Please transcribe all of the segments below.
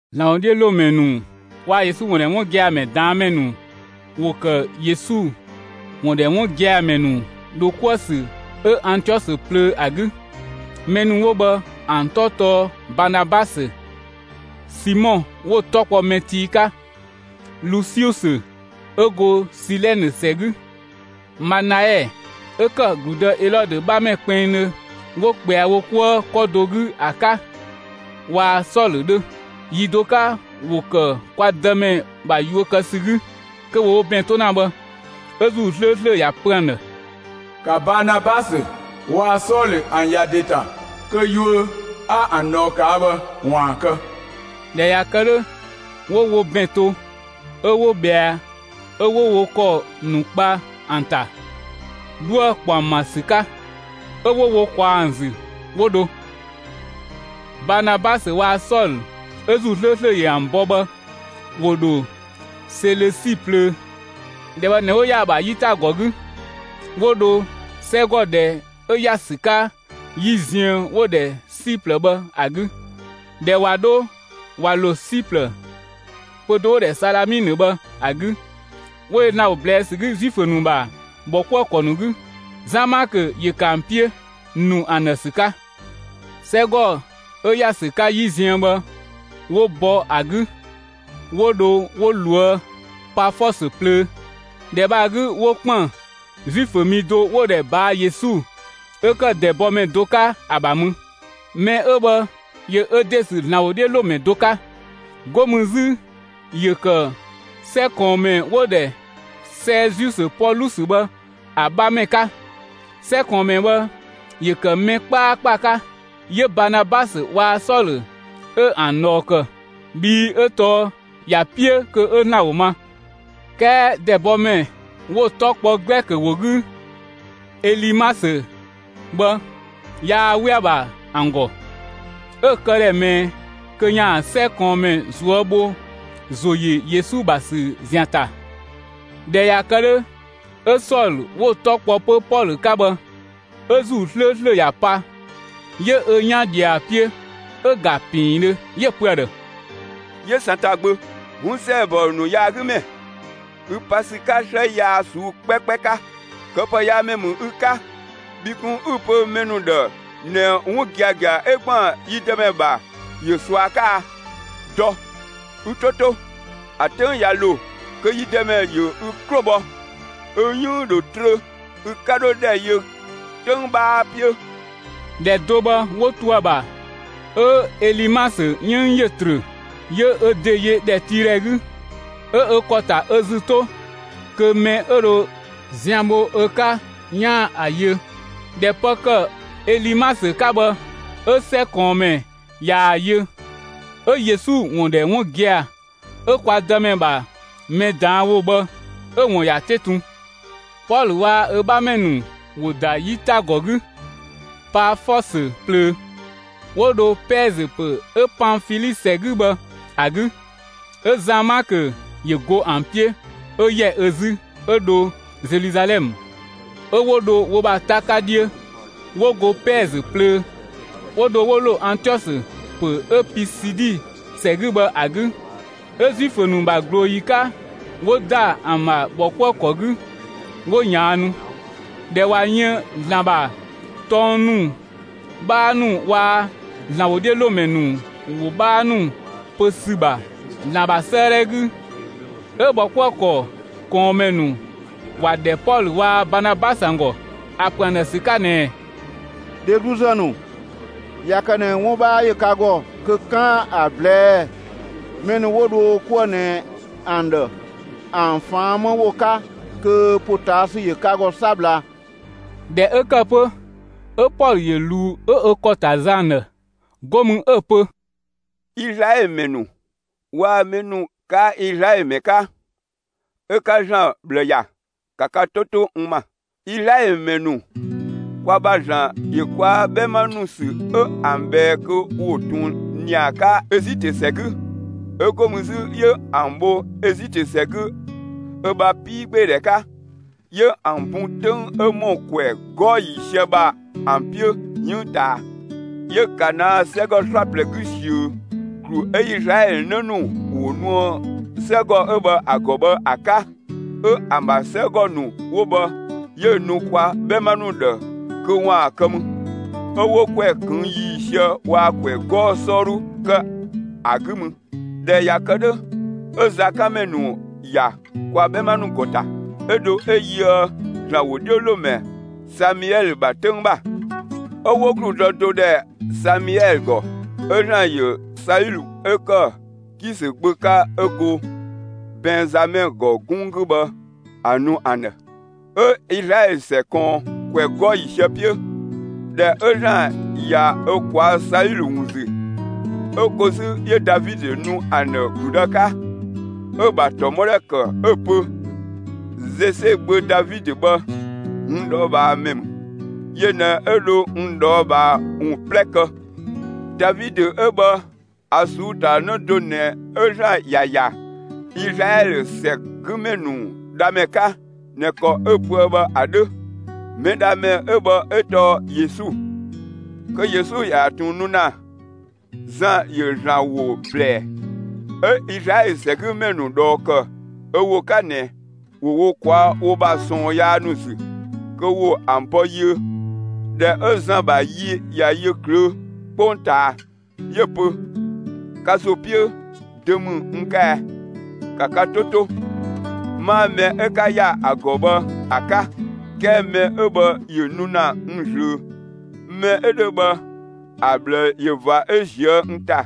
‑Zlan ‑wodhiölomɛ ‑nu waa‑ Yesu ‑wun ‑dhɛ 'wun gia‑ ‑mɛ ꞊daan' ‑mɛ ‑nu ‑wo ‑kë Yesu ‑wun ‑dhɛ 'wun gia‑ ‑mɛ ‑nu ‑dho 'kuë‑ ‑sü 'ö Antiɔsö plöö ‑a 'gü. Mɛ ‑nu 'wo bhë ‑an 'tɔ tɔɔ Baanabasö, Simɔ 'wo‑ 'tɔ kpɔ «mɛ tii» 'ka, Lusiusö 'ö go Silɛnë ‑sɛ 'gü, Manaɛ 'ö ‑kë ‑gludë Elɔdö 'bhamɛ kpinngdhö 'wo ꞊kpɛa wo 'kuë 'kɔ do 'gü ‑a 'ka, waa‑ Sɔlö 'dhö. Yi do 'ka, ‑wo ‑kë kwa Dëmɛ ‑bha yuö kë ‑sü 'gü, kö ‑wo wo ‑bɛn 'to ‑na bhë, 'ö ‑Zuu 'slööslö ‑ya pö ‑an ‑dhë: «‑Ka Baanabasö waa‑ Sɔlö ‑an ‑ya ‑de ‑ta kö yuö 'a ‑an ꞊dhɔɔ ꞊kaa' bhë ‑waan ‑a kë!» ꞊Dhɛ ꞊ya kë 'dhö, 'wo wo ‑bɛn to 'ö 'wo ꞊bhɛa, 'ö 'wo wo ‑kɔ ‑nu kpa ‑an ‑ta, 'dhuë‑ kpɔ ‑an ‑bha ‑sü 'ka, 'ö 'wo wo ꞊kwaa ‑an ‑zü, 'wo dho. Baanabasö waa‑ Sɔlö 'ö ‑Zuu 'slööslö ‑yö ‑an bɔ bhë, ‑wo ‑dho Selösi plöö. ‑Dhɛ bhë ꞊nɛ, 'wo ‑ya ‑a ‑bha 'yitagɔ 'gü, 'wo dho 'sɛgɔ ‑dhɛ 'ö ‑ya ‑sü 'ka 'yi ziën 'wo‑ ‑dhɛ Siplë bhë ‑a 'gü. ꞊Dhɛ ꞊wa 'dho ꞊wa ‑lo Siplë, pö‑ do 'wo‑ ‑dhɛ Salaminö bhë ‑a 'gü, 'wo yö ‑Zlan ‑wo ꞊blɛɛ' ‑sü 'gü Zuifö ‑nu ‑bha ‑bhɔkuëkɔ ‑nu 'gü. Zan Maakö ‑yö ‑kë ‑an 'piö, ‑nu ‑an ‑dhë ‑sü 'ka. 'Sɛgɔ 'ö ‑ya ‑sü 'ka 'yi ziën bhë 'wo bɔ ‑a 'gü, 'wo dho 'wo loë Pafɔsö plöö. ‑Dhɛ bhë ‑a 'gü 'wo ‑kpën Zuifö mi do 'wo‑ ‑dhɛ Baa Yesu 'ö ‑kë ‑dɛbɔmɛ do 'ka ‑a ‑bha mü. Mɛ 'ö bhë ‑yö ö ‑de ‑sü ‑Zlan ‑wodhiölomɛ do 'ka. 'Go mü 'zü ‑yö ‑kë 'sɛ ꞊kɔɔnmɛ 'wo‑ ‑dhɛ Sɛɛziusö Pɔlusö bhë ‑a 'bhamɛ 'ka. 'Sɛ ꞊kɔɔnmɛ bhë ‑yö ‑kë mɛ 'kpaakpa 'ka; 'yö Baanabasö waa‑ Sɔlö 'ö ‑an ꞊dhɔɔ ‑kë, bhii 'ö tɔɔ ‑ya 'piö kö 'ö ‑Zlan ‑wo ma. 'Kɛɛ ‑dɛbɔmɛ ('wo‑ 'tɔ kpɔ Glɛkö ‑wo 'gü «Elimasö») bhë yaa 'we ‑a ‑bha ‑an ‑gɔ; 'ö‑ këdhɛ ꞊mɛɛ kö 'yaan‑ 'sɛ ꞊kɔɔnmɛ ꞊zuö' bho ‑zo ‑yö Yesu ‑bha ‑sü ‑zian ‑ta. ꞊Dhɛ ꞊ya kë 'dhö, 'ö Sɔlö 'wo‑ 'tɔ kpɔ 'pö Pɔlö 'ka bhë, 'ö ‑Zuu 'slööslö ‑ya pa, 'yö ö 'yan ꞊dhië ‑a 'piö 'ö‑ ‑ga ‑piindhö, 'yö‑ pö ‑a ‑dhë: «'Yö Satan gbö, 'wun ‑sɛɛbɔ ‑nu yaagümɛ, 'ü pa ‑sü 'ka 'slë yaa ꞊suu'‑ 'kpɛkpɛ 'ka; këpëyaamɛ ‑mü ü 'ka! Bhi kun 'ü‑ pö mɛ ‑nu ‑dhë ꞊nɛ 'wun giagia 'ö ‑gban yi Dëmɛ ‑bha ‑yö ꞊sua 'ka a? Dɔ, ü 'to 'to! ‑A 'töng ꞊ya ‑lo kö yi Dëmɛ ‑yö ü 'klo bhɔ; ü 'yënng‑ ‑dho trö, ü 'ka 'dho ‑dhɛ yö 'töng 'bhaa 'piö!» ‑Dhɛ do bhë 'wo to ‑a ‑bha 'ö Elimasö 'yënng ‑yö ‑trö; 'yö ö ‑de yö ‑dhɛtiidhɛ 'gü. 'Ö ö ‑kɔ ‑ta ö ‑zü 'to kö mɛ 'ö dho zian bho ö 'ka 'yaan‑ ‑a yö. ꞊Dhɛ pë ‑kë Elimasö 'ka bhë 'ö 'sɛ ꞊kɔɔnmɛ ꞊yaa‑ yö, 'ö Yesu ‑wun ‑dhɛ 'wun gia‑, 'ö kwa Dëmɛ ‑bha mɛ ꞊daan' ‑wo bhë 'ö‑ ‑wun ‑ya 'te tun. Pɔlö waa‑ ö 'bhamɛ ‑nu ‑wo ‑da 'yitagɔ 'gü Paafɔsö plöö, 'wo dho Pɛɛzö ‑pö 'ö Panfili ‑sɛ 'gü bhë ‑a 'gü; 'ö Zan Maakö ‑yö go ‑an 'piö 'ö ‑yɛ ö 'zü 'ö dho Zeluzalɛmë. 'Ö 'wo dho wo ‑bha 'ta 'ka 'dhiö, 'wo go Pɛɛzö plöö, 'wo dho 'wo ‑lo Antiɔsö ‑pö 'ö Pisidi ‑sɛ 'gü bhë ‑a 'gü. 'Ö Zuifö ‑nu ‑bha ꞊glooyi 'ka, 'wo ‑da ‑an ‑bha ‑bhɔkuëkɔ 'gü 'wo ꞊yaannu. ꞊Dhɛ ꞊wa yën ‑Zlan ‑bha tɔng ‑nu 'bhaa ‑nu waa‑ ‑Zlan ‑wodhiölomɛ ‑nu ‑wo 'bhaa ‑nu pö ‑sü ‑bha ‑Zlan ‑bha 'sëëdhɛ 'gü, 'ö ‑bhɔkuëkɔ ꞊kɔɔnmɛ ‑nu ‑wa ‑dhɛ Pɔlö waa‑ Baanabasö ‑an ‑gɔ ‑a ‑pö ‑an ‑dhë ‑sü 'ka ꞊nɛɛ: «Dhegluzë ‑nu, ꞊ya kë ꞊nɛ 'wun 'bhaa ‑yö ka ‑gɔ kö 'kaan‑ ‑a ꞊blɛɛ'‑ mɛ ‑nu 'wo dho wo 'kuë‑ ꞊nɛ ‑an ‑dhë ‑an ꞊faan' 'më ‑wo 'ka kö ‑potaasü ‑yö ka ‑gɔ 'sabla.» ꞊Dhɛ 'ö ‑kë 'pö, 'ö Pɔlö ‑yö ꞊luu 'ö ö ‑kɔ ‑ta zë ‑an ‑dhë, 'go mü 'ö‑ pö: «Izlaɛlö ‑mɛ ‑nu waa‑ mɛ ‑nu 'kaa Izlaɛlö ‑mɛ 'ka, 'ö 'ka ‑Zlan ꞊bhlë ‑ya, ‑ka ka 'to 'to n ‑ma! Izlaɛlö ‑mɛ ‑nu, kwa ‑bha ‑Zlan ‑yö kwa 'bhɛma ‑nu ‑sü 'ö ‑an ꞊bhɛɛ kö ‑wo ꞊tun ‑nia 'ka Ezitö ‑sɛ 'gü. 'Ö 'go mü 'zü 'yö ‑an bho Ezitö ‑sɛ 'gü ö ‑bha 'piigbeedhɛ 'ka. 'Yö ‑an bun 'töng 'ö ‑mɔ ‑kwɛ 'gɔɔ‑ ‑yiisië ‑bha ‑an 'piö 'yënng ꞊taa. 'Yö Kanaa 'sɛgɔ 'slaplɛ 'gü ꞊siö, ‑glu 'ö Izlaɛlö 'në ‑nu ‑wo nuë 'sɛgɔ 'ö bhë ‑a ‑gɔ bhë ‑a 'ka. 'Ö ‑an ‑bha 'sɛgɔ ‑nu 'wo bhë 'yö‑ nu kwa 'bhɛma ‑nu ‑dhë kö ‑waan kë mü. 'Ö 'wo ‑kwɛ ꞊këng' ‑yiisië waa‑ ‑kwɛ 'gɔɔ‑ 'sɔɔdhu ‑kë ‑a 'gü mü. ꞊Dhɛ ꞊ya kë 'dhö, 'ö zakanmɛ ‑nu ‑ya kwa 'bhɛma ‑nu ‑gɔ ‑ta, 'ö dho 'ö yöë ‑Zlan ‑wodhiölomɛ Samiɛlö ‑bha 'töng ‑bha. 'Ö 'wo ‑gludë do ‑dhɛ Samiɛlö ‑gɔ, 'ö ‑Zlan ‑yö Saulö 'ö ‑kë Kisö gbö 'ka 'ö go Bɛnzamɛ ‑gɔ 'gunng 'gü bhë ‑a nu ‑an ‑dhë. 'Ö Izlaɛlö ‑sɛ ꞊kɔɔn ‑kwɛ 'gɔɔ‑ ‑yiisië 'piö. ꞊Dhɛ 'ö ‑Zlan ꞊ya ö ꞊kwaa' Saulö ‑wun ‑zü, 'ö ko 'zü 'yö Davidö nu ‑an ‑dhë ‑gludë 'ka. 'Ö‑ ‑bha ‑tɔmɔdhɛ ‑kë 'ö‑ pö: Zese gbö Davidö bhë, n ꞊dhɔɔbhaa ‑mɛ ‑mü. Yö ꞊nɛ 'ö dho n ꞊dhɔɔbhaa ‑wun 'plɛ kë. Davidö 'ö bhë ‑a ꞊suu'‑ ‑ta 'në do ꞊nɛ 'ö ‑Zlan ‑ya ‑ya Izlaɛlö ‑sɛgümɛ ‑nu Dhamɛ 'ka ꞊nɛ ‑kɔ 'ö‑ pöë bhë ‑a 'dhö. Mɛdhamɛ 'ö bhë 'ö tɔɔ Yesu. Kö Yesu ‑yaan ꞊tun nu ‑na, Zan ‑yö ‑Zlan ‑wo ꞊blɛɛ, 'ö Izlaɛlö ‑sɛgümɛ ‑nu ꞊dhɔɔ ‑kë ö ‑wo 'ka ꞊nɛ ‑wo wo ꞊kwaa' wo ‑bha ꞊sɔɔn yaa ‑nu ‑zü kö ‑wo ‑an bɔ yiö. ꞊Dhɛ 'ö Zan ‑bha yi ꞊ya yö ꞊klöö' 'kpongtaa, 'yö‑ pö: ‹Ka ‑zo 'piö, dö ‑mü n 'ka ɛ? ‑Ka ka 'to 'to, 'maa mɛ ö 'ka ‑ya ‑a ‑gɔ bhë ‑a 'ka; 'kɛɛ mɛ 'ö bhë ‑yö nu ‑na n ꞊zlöö. Mɛ 'ö 'dhö bhë ‑a ꞊bhlë ꞊yö ꞊va 'ö ꞊zië' n ‑ta,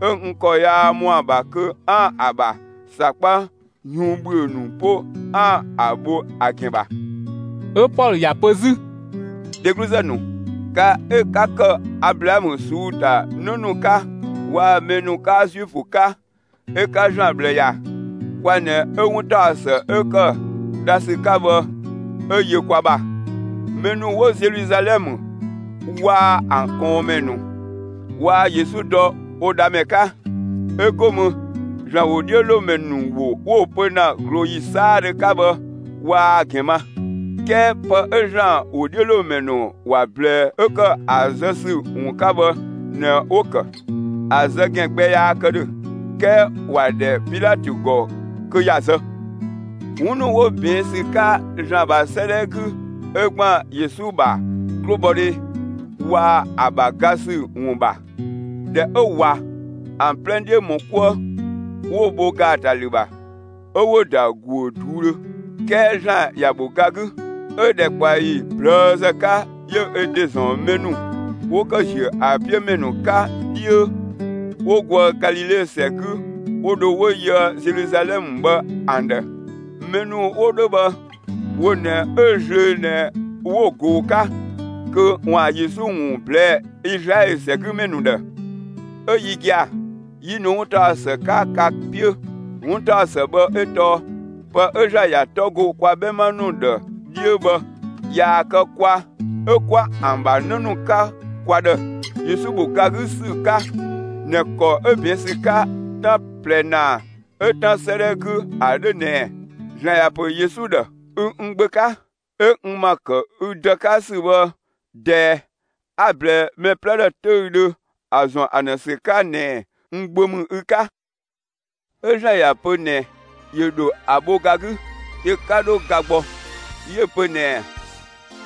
'ö n ‑kɔ yaa ‑mɔa ‑bha kö 'aan‑ ‑a ‑bha ‑sakpa yuun ‑bhüö ‑nu 'po 'aan‑ ‑a bho ‑a ‑gɛn ‑bha.›» 'Ö Piɛɛ ‑ya pö 'zü: «Dhegluzë ‑nu, ka 'ö 'ka ‑kë Ablaamö ꞊suu'‑ ‑ta 'në ‑nu 'ka, waa‑ mɛ ‑nu 'kaa Zuifö 'ka, 'ö 'ka ‑Zlan ꞊bhlë ‑ya, kwa ꞊nɛ 'ö 'wuntaɔsë 'ö ‑kë dha ‑sü 'ka bhë, 'ö yö kwa ‑bha. Mɛ ‑nu 'wo Zeluzalɛmë waa‑ ‑an ꞊kɔɔnmɛ ‑nu waa Yesu dɔ wo Dhamɛ 'ka; 'ö 'go mü ‑Zlan ‑wodhiölomɛ ‑nu ‑wo 'wo‑ pö ‑na ꞊glooyi 'saadhö 'ka bhë, waa‑ ‑gɛn ma. 'Kɛɛ pë 'ö ‑Zlan ‑wodhiölomɛ ‑nu ‑wa ꞊blɛɛ 'ö ‑kë ‑a zë ‑sü ‑wun 'ka bhë ꞊nɛ 'wo‑ ‑kë. ‑A zë ‑gɛn gbɛ yaa kë ‑dhö, 'kɛɛ ‑wa ‑dhɛ Pilatö ‑gɔ kö ‑ya zë. 'Wun ‑nu 'wo ꞊bɛɛn' ‑sü 'ka ‑Zlan ‑bha 'sëëdhɛ 'gü 'ö ‑gban Yesu ‑bha 'klobhɔdhe waa‑ ‑a ‑bha ga ‑sü ‑wun ‑bha, ꞊dhɛ 'ö ꞊wa ‑an 'plɛ 'dhiö ‑mɔ 'kuë, 'wo‑ bho ‑gaatalü ‑bha, 'ö 'wo‑ ‑da ‑guö ꞊duudhö. 'Kɛɛ ‑Zlan ‑ya ‑bho ga 'gü. 'Ö ‑dhɛkpaɔyi ꞊plëëzë 'ka, 'yö ö ‑de ‑zɔn mɛ ‑nu 'wo ‑kë ‑ziö ‑a 'piö ‑mɛ ‑nu 'ka 'dhiö, 'wo goë Galile ‑sɛ 'gü, 'wo dho 'wo yöë Zeluzalɛmë bhë ‑an ‑dhë. Mɛ ‑nu 'wo 'dhö bhë, wo ꞊nɛ 'ö zlöö ꞊nɛ 'wo‑ ꞊goo‑ 'ka kö ‑waan Yesu ‑wun ꞊blɛɛ'‑ Izlaɛlö ‑sɛgümɛ ‑nu ‑dhë. 'Ö yi gia‑, 'yi nu 'wuntaɔsë 'ka ka 'piö. 'Wuntaɔsë bhë 'ö tɔɔ pë 'ö ‑Zlan ‑ya 'tɔ go kwa 'bhɛma ‑nu ‑dhë 'dhiö bhë. ꞊Yaa‑ kë kwa 'ö 'kwa ‑an ‑bha 'në ‑nu 'ka kwa ‑dhë, Yesu ‑bho ga 'gü ‑sü 'ka ꞊nɛ ‑kɔ 'ö ꞊bɛɛn' ‑sü 'ka 'tan ꞊plɛ ‑naa 'ö 'Tan 'sëëdhɛ 'gü ‑a 'dhö ꞊nɛɛ: (‑Zlan ‑ya ‑pö Yesu ‑dhë:) Ü n Gbö 'ka. 'Ö n ‑ma ‑kë ü Dë 'ka ‑sü bhë ꞊dɛɛ 'a‑ ꞊blɛɛ mɛ 'plɛ ‑dhë 'töüdhö ‑a ‑zɔn ‑an ‑dhë ‑sü 'ka ꞊nɛɛ n Gbö ‑mü ü 'ka. 'Ö ‑Zlan ‑ya pö ꞊nɛ yö ‑dho ‑a bho ga 'gü; yö 'ka 'dho ga gbɔ. 'Yö‑ pö ꞊nɛɛ: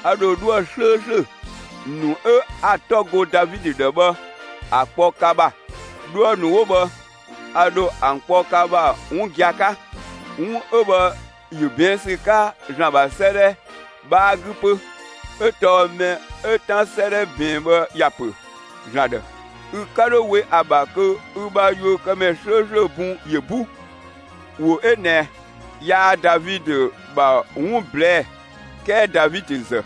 A ‑dho 'dhuë‑ 'slööslö ‑nu 'ö 'a‑ 'tɔ go Davidö ‑dhë bhë ‑a kpɔ ka ‑bha. 'Dhuë‑ ‑nu 'wo bhë, a ‑dho ‑an kpɔ ka ‑bha 'wun gia‑ 'ka. 'Wun 'ö bhë ‑yö ꞊bɛɛn' ‑sü 'ka ‑Zlan ‑bha 'sëëdhɛ ‑dhɛ 'bhaa 'gü 'pö, 'ö tɔɔ mɛ 'ö 'Tan 'sëëdhɛ ꞊bɛɛn bhë ‑ya ‑pö ‑Zlan ‑dhë: Ü 'ka 'dho we ‑a ‑bha kö ü ‑bha yuökëmɛ 'slööslö bun ‑yö 'bu. ‑Wo 'ö ꞊nɛ yaa Davidö ‑bha 'wun ꞊blɛɛ'‑, 'kɛɛ Davidö ‑zë,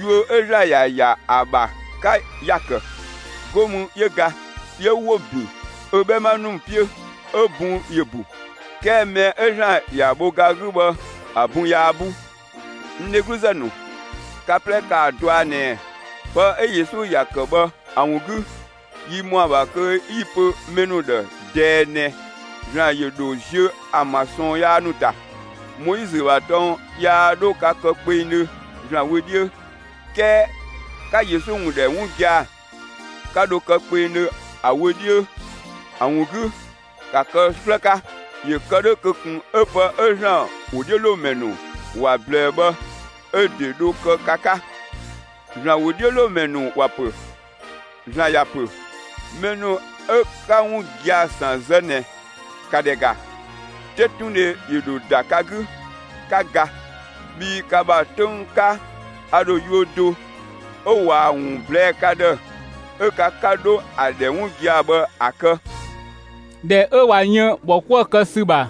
yuö 'ö ‑Zlan ‑ya ‑ya ‑a ‑bha 'ka ‑ya ‑kë. 'Go mü 'yö ga, 'yö 'wo‑ ‑bin ö 'bhɛma ‑nu 'piö, 'ö‑ bun ‑yö ‑bu. 'Kɛɛ mɛ 'ö ‑Zlan ‑ya bho ga 'gü bhë ‑a bun yaa 'bu. N dhegluzë ‑nu, ka 'plɛ ‑kaa dɔa ꞊nɛɛ pë 'ö Yesu ‑ya ‑kë bhë ‑a ‑wun 'gü, yi ‑mɔa ‑bha kö 'yi‑ pö mɛ ‑nu ‑dhë ꞊dɛɛ ꞊nɛ ‑Zlan ‑yö ‑dho ziö ‑an ‑bha ꞊sɔɔn yaa ‑nu ‑ta. Moizö ‑bha tɔng yaa 'dho ka kë kpengdhö ‑Zlan wö 'dhiö; 'kɛɛ 'ka Yesu ‑wun ‑dhɛ 'wun gia‑, 'ka dho kë kpengdhö ‑a wö 'dhiö. ‑A ‑wun 'gü, ‑ka kë 'slë 'ka! ‑Yö kë 'dhö kö ꞊kun 'ö pë 'ö ‑Zlan ‑wodhiölomɛ ‑nu ‑wa ꞊blɛɛ bhë 'ö‑ ‑de dho kë ka 'ka: ‑Zlan ‑wodhiölomɛ ‑nu ‑wa ‑pö: (‑Zlan ‑ya pö:) Mɛ ‑nu 'ö 'ka 'wun gia‑ ‑san zë ꞊nɛ, ‑ka ‑dhɛ ‑ga: 'Tetundhe ‑yö ‑dho ‑da ka 'gü, 'ka ga. Bhii ka ‑bha 'töng 'ka, a ‑dho yuö do 'ö ꞊waa‑ ‑wun ꞊blɛɛ'‑ ka ‑dhë, 'ö ka 'ka 'dho ‑a ‑dhɛ 'wun gia‑ bhë ‑a kë.» ꞊Dhɛ 'ö ꞊wa yën ‑bhɔ 'kuë‑ kë ‑sü ‑bha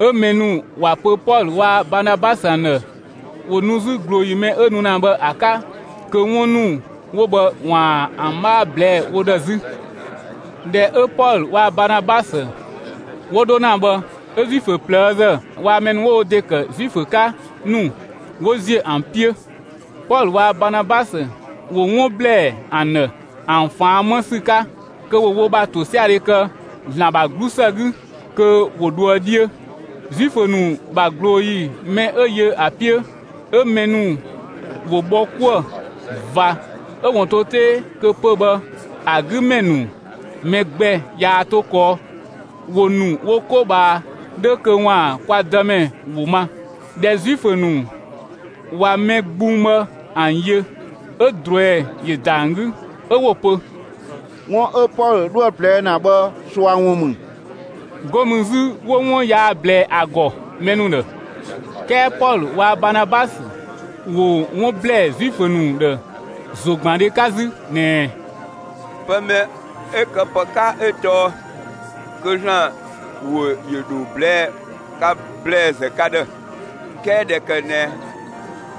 'ö mɛ ‑nu ‑wa pö Pɔlö waa‑ Baanabasö ‑an ‑dhë ‑wo nu 'zü ꞊glooyi mɛ 'ö nu ‑na bhë ‑a 'ka kö 'wun ‑nu 'wo bhë ‑waan ‑an 'bhaa ꞊blɛɛ'‑ wo ‑dhë 'zü. ꞊Dhɛ 'ö Pɔlö waa‑ Baanabasö 'wo 'dho ‑na bhë 'ö Zuifö ꞊plëëzë waa‑ mɛ ‑nu 'wo wo ‑de ‑kë Zuifö 'ka ‑nu 'wo ‑ziö ‑an 'piö. Pɔlö waa‑ Baanabasö ‑wo 'wun ‑blɛɛ ‑an ‑dhë ‑an ꞊faan' 'më ‑sü 'ka kö ‑wo wo ‑bha ‑tosiadhe kë ‑Zlan ‑bha 'glusë 'gü kö ‑wo 'dhoë‑ 'dhiö. Zuifö ‑nu ‑bha ꞊glooyi mɛ 'ö yö ‑a 'piö, 'ö mɛ ‑nu ‑wo bhɔ 'kuë‑ ꞊va 'ö‑ ‑wun to 'tee kö pö‑ bhë ‑a 'gü ‑mɛ ‑nu mɛ gbɛ yaa 'to kɔɔ; ‑wo ‑nu wo 'ko ꞊bhaa 'dhö kö ‑waan kwa Dëmɛ ‑wo ma. ꞊Dhɛ Zuifö ‑nu ꞊wa mɛ gbung bhë ‑an yö, 'ö ꞊druɛi ‑yö ‑da ‑an 'gü 'ö 'wo‑ pö: «'Wun 'ö Pɔlö 'dhoë‑ ꞊blɛɛ' ‑na bhë ꞊sua ‑wun ‑mü.» 'Go mü 'zü 'wo 'wun yaa ꞊blɛɛ ‑a ‑gɔ mɛ ‑nu ‑dhë. 'Kɛɛ Pɔlö waa‑ Baanabasö ‑wo 'wun ‑blɛɛ Zuifö ‑nu ‑dhë ‑zogbandhe 'ka 'zü ꞊nɛɛ: «Pë mɛ 'ö këpë 'ka 'ö tɔɔ kö ‑Zlan ‑wo ‑yö ‑dho ꞊blɛɛ'‑ ka ‑blɛɛzë ka ‑dhë. 'Kɛɛ ꞊dhɛ ‑kë ꞊nɛ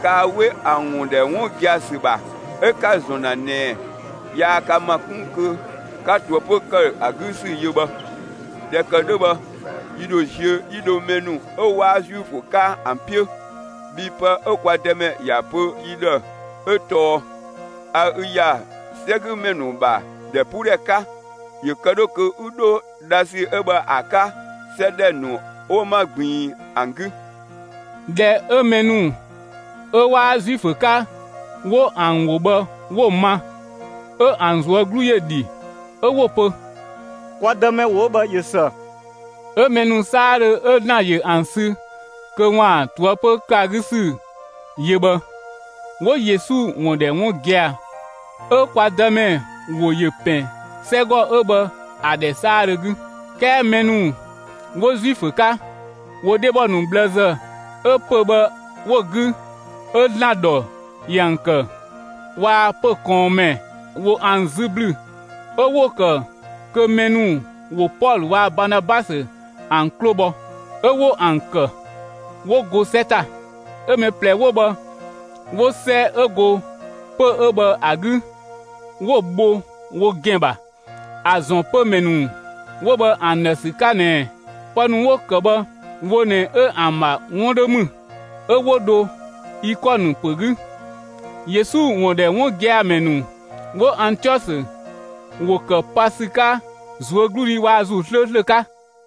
kaa 'we ‑a ‑wun ‑dhɛ 'wun gia‑ ‑sü ‑bha, 'ö 'ka‑ ‑zɔn ‑na ꞊nɛɛ yaa ka ‑ma 'kun kö 'ka ꞊toëpö ‑kë ‑a 'gü ‑sü yö bhë. ꞊Dhɛ ‑kë 'dhö bhë, yi ‑dho ziö 'yi dho mɛ ‑nu 'ö 'waa Zuifö 'ka ‑an 'piö. Bhii pë 'ö kwa Dëmɛ ‑ya pö yi ‑dhë 'ö tɔɔ: A ü ‑ya 'sɛgümɛ ‑nu ‑bha ‑dhɛpuudhɛ 'ka. ‑Yö kë 'dhö kö 'ü 'dho dhasü 'ö bhë ‑a 'ka 'sɛ ‑dhɛ ‑nu 'wo 'ma ꞊gbiin ‑an 'gü.» ꞊Dhɛ 'ö mɛ ‑nu 'ö 'waa Zuifö 'ka, 'wo ‑an ‑wo bhë 'wo‑ ma, 'ö ‑an ꞊zuö' 'glu ‑yö dhi; 'ö 'wo‑ pö: «Kwa Dëmɛ ‑wo 'ö bhë ꞊yö ‑së!» 'Ö mɛ ‑nu 'saadhö 'ö ‑Zlan ‑yö ‑an sü kö ‑waan ꞊toëpö ‑kë ‑a 'gü ‑sü yö bhë, 'wo Yesu ‑wun ‑dhɛ 'wun gia‑. 'Ö kwa Dëmɛ ‑wo ‑yö ‑pɛn 'sɛgɔ 'ö bhë ‑a ‑dhɛ 'saadhö 'gü. 'Kɛɛ mɛ ‑nu 'wo Zuifö 'ka, ‑wo dhebɔ ‑nu ꞊bhlëzë 'ö pö‑ bhë 'wo‑ 'gü 'ö ‑Zlan ‑dhɔ ‑yö ‑an ‑kë, waa‑ pö‑ ꞊kɔɔnmɛ ‑wo ‑an 'zü ‑blü 'ö 'wo‑ ‑kë kö mɛ ‑nu ‑wo Pɔlö waa‑ Baanabasö ‑an 'klo bhɔ; 'ö 'wo ‑an ‑kë, 'wo go 'sɛ ‑ta. 'Ö mɛ ꞊plɛ 'wo bhë 'wo 'sɛ 'ö go pö‑ 'ö bhë ‑a 'gü, 'wo‑ bho wo ‑gɛn ‑bha, ‑a ‑zɔn pömɛ ‑nu 'wo bhë ‑an ‑dhë ‑sü 'ka ꞊nɛ pë ‑nu 'wo‑ ‑kë bhë wo ꞊nɛ 'ö ‑an ‑bha 'wun 'dhö ‑mü. 'Ö 'wo dho Ikɔnë ‑pö 'gü. Yesu ‑wun ‑dhɛ 'wun gia‑ ‑mɛ ‑nu 'wo Antiɔsö, ‑wo ‑kë pa ‑sü 'ka ꞊zuögludhi waa‑ ‑Zuu 'slööslö 'ka.